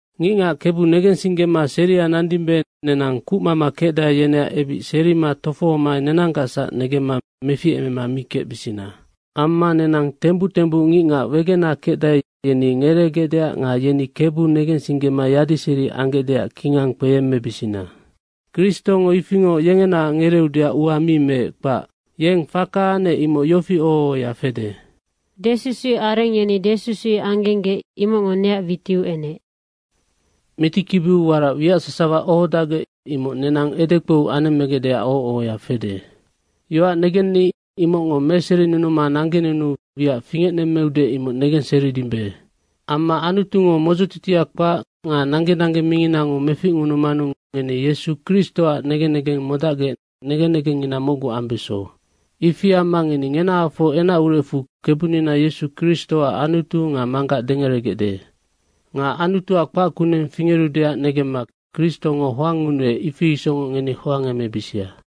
Ngicngac Kebu negensinggema seria nandimbe, nenang kucmama kecdae, yeneac ebic serima tofohoma nenanggacsac negemma meficemema mi kecbisina. Amma nenang tembuc tembuc ngicngac wegena kecdae, yeni ngereegecdeac nga yeni Kebu negensinggema yadiseri anggecdeac kingang kpeyemmebisina. Kristongo ifingoc yengenaac ngereeudeac ua mi meec, kpac. Yeng faka anec imoc yofi oho ohoya fede, “Desusuic areng yeni desusuic anggenggec, imocngo neac witiu enec.” Mitikibiu warac wiac sasawa ohodacgec, imoc nenang edekpou anemmegecdeac oho ohoya fede. Yoac negenni imocngo meserinunuma nanggenunuu wiac fingecnemmeude, imoc negenseridimbe. Amma Anutungo modzotitia kpac nga nangge nangge minginango meficngunumanu ngeni Yesu Kristoac negen negeng modacgec negen negengngina mocgu ambeso. Ifi amma ngeni ngenahafoc enacurecfu Kebunina Yesu Kristoac Anutu nga Manggac dengeregecde. Nga Anutuac kpac kuneng fingerudeac negemma Kristongo hoangngunuec, ifi isocngoc ngeni hoangemebisia.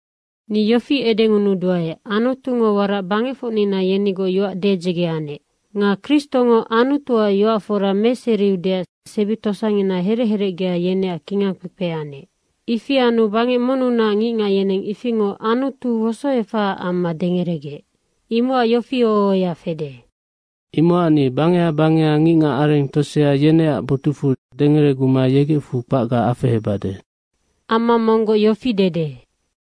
Ni yofi edengunuduae, Anutungo warac bangecfocnina yenigoc yoac dedzege anec. Nga Kristongo Anutuac yoac fora meseriudeac sebi tosangina herec herecgea yeneac kingang kpekpe anec. Ifi anu bangec monnunac ngicngac, yeneng ifingoc Anutu wosoefahaac amma dengeregec. Imocac yofi oho ohoya fede, “Imocac ni bangeha bangeha ngicngac areng tosea, yeneac botucfu dengereguma yegecfu kpacga afehebade.” Amma monggoc yofi dede,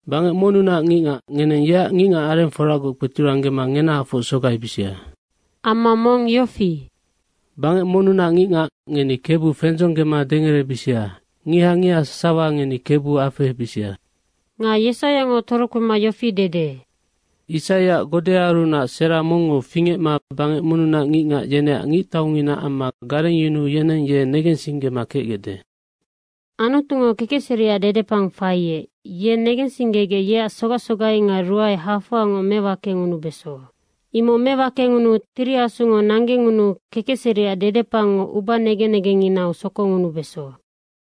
“Bangec monnunac ngicngac, ngeneng yeac ngicngac arengforagoc kpeturanggema ngenahafoc sogaibisia.” Amma mong yofi, “Bangec monnunac ngicngac, ngeni KEBU fendzonggema dengerebisia. Ngiha ngiha sasawa ngeni KEBU afehebisia.” Nga Yesaiango torokpema yofi dede, “Isaiac godeaarunac sera mongngo fingecma bangec monnunac ngicngac, yeneac ngictaungina amma garengyunuu yeneng ye negensinggema kecgecde.” Anutungo kekecseriac dedepang faiec, ye negensinggegec yeac sogac sogai nga ruae hafoangoc mewakengunubeso. Imoc mewakengunuu Tiri Asungo nanggengunuu kekecseriac dedepangngo ubanegen negengnginau sokongunubeso.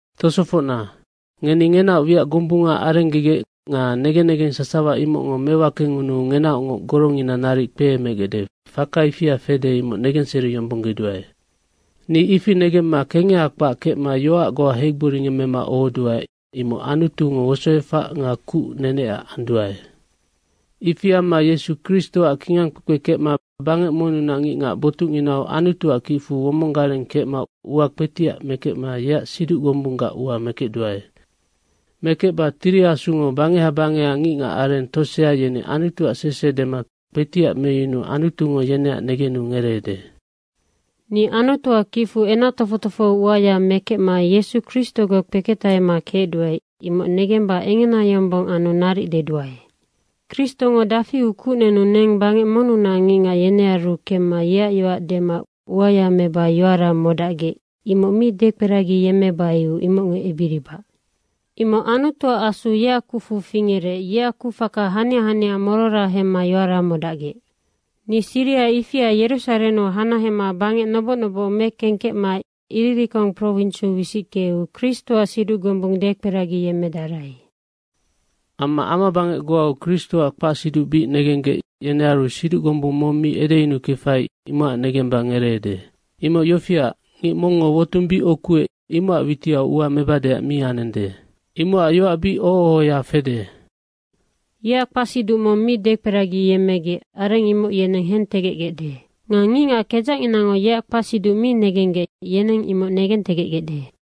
Tosofocna, ngeni ngenaoc wiac gombunga arenggegec nga negen negeng sasawa imocngo mewakengunuu ngenaocngoc gorongina naric kpeemegecde, fakangina ifia fede, imoc negenseriyombonggeduae. Ni ifi negemma kengeha kpac kecma yoac goa heigboringemmema ohoduae, imoc Anutungo wosoefac nga kuc nenecac anduae. Ifi amma Yesu Kristoac kingangkpekpe kecma bangec monnunac ngicngac botucnginau Anutuac kicfu womonggareng kecma ua kpetiac mekecma yeac siduc gombunggac ua mekecduae. Mekecba Tiri Asungo bangeha bangeha ngicngac areng tosea, yeni Anutuac sese dema kpetiac meyunuu Anutungo yeneac negenu ngereede. Ni Anutuac kicfu kingang kpekpe uaya mekecma Yesu Kristogoc kpeketahema kecduae, imoc negemba engena yombong anu naric deduae. Kristongo dafiu kuc nenu neng bangec monnunac ngicngac yenearu kemma yeac yoac dema uaya meba yoara modacgec, imoc mi dekperagiyemmebaiu imocngo ebiribac. Imoc Anutuac Asu yeac kucfu fingerec, yeac kucfaka hania hania morora hemma yoara modacgec. Ni siriha ifia Yerusarennu hanahema bangec noboc noboc mekengkecma Iririkong prowinsiu wisickeu Kristoac siduc gombung dekperagiyemmedarai. Amma amabangec goau Kristoac kpacsiduc bic negenggec, yenearu siduc gombung mong mi edeyunukefai, imocac negemba ngereede. Imoc yofiac, ngic mongngo wotung bic ukuec, imocac witiau ua mebadeac mi anende. Imocac yoac bic oho ohoya fede, “Yeac kpacsiduc mong mi dekperagiyemmegec, areng imoc yeneng hentegecgecde. Nga ngicngac kedzacnginango yeac kpacsiduc mi negenggec, yeneng imoc negentegecgecde.”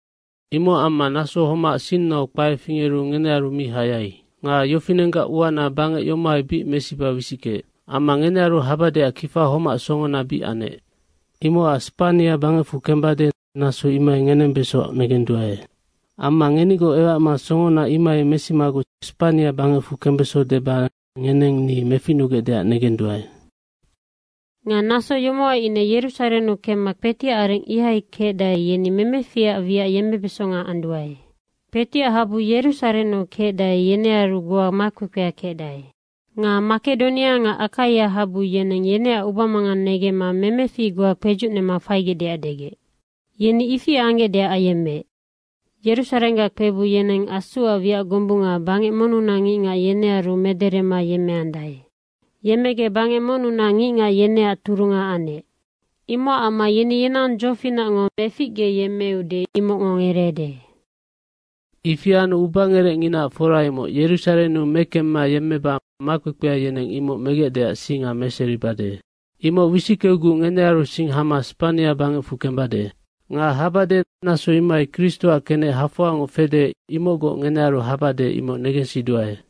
Imocac amma naso homac sinnau kpae fingeru ngenearu mi hayai. Nga yofinenggac uana bangec yomohai bic mesiba wisickeec. Amma ngenearu habadeac kifa homac songona bic anec. Imocac Spania bangecfu kembade, naso imohai ngenembeso negenduae. Amma ngenigoc ewacma songona imohai mesimaguc Spania bangecfu kembeso deba ngeneng ni meficnugecdeac negenduae. Nga naso yomohai ine Yerusarennu kemma kpetiac areng ihai kecdae, yeni memeficac wiac yemmebesonga anduae. Kpetiac habu Yerusarennu kecdae, yenearunac goa makpekpea kecdae. Nga Makedonia nga Akaia habu yeneng yeneac ubamangang negemma memefic goa kpedzucnema faigecdeac degec. Yeni ifi anggecdeac ayemmeec. Yerusarenggac kpebung yeneng Asuac wiac gombunga bangec monnunac ngicngac, yenearu mederema yemmegec bangec monnunac ngicngac, yeneac turunga anec. Imocac amma yeni yenang dzofinacngo meficgeyemmeude imocngo ngereede. Ifi anu ubangerecnginaac fora imoc Yerusarennu mekemma yemmeba makpekpea yeneng imoc megecdeac singa meseribade. Imoc wisickeuguc ngenearu sing hama Spania bangecfu kembade. Nga habade, naso imohai Kristoac kenec hafoangoc fede, imocgoc ngenearu habade, imoc negensiduae.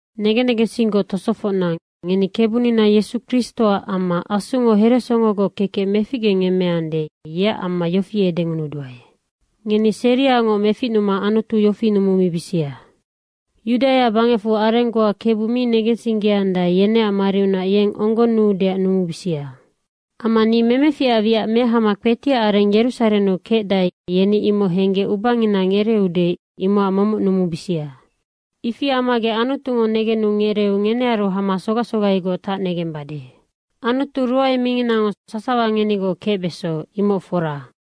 Negen negensinggoc tosofocna, ngeni Kebunina Yesu Kristoac amma Asungo heresongogoc kekec meficgenemmeande, yeac amma yofi edengunuduae, ngeni seriangoc meficnuma Anutu yofi numumibisia, Yudaia bangecfu areng goa Kebu mi negensinggeandae, yeneac mariunac yeng onggonnuudeac numubisia. Amma ni memeficac wiac mehama kpetiac areng Yerusarennu kecdae, yeni imoc henggec ubangina ngereeude, imocac momoc numubisia. Ifi ammagec Anutungo negenu ngereeu ngenearu hama sogac sogaigoc tacnegembade. Anutu ruae minginango sasawa ngenigoc kecbeso, imoc fora.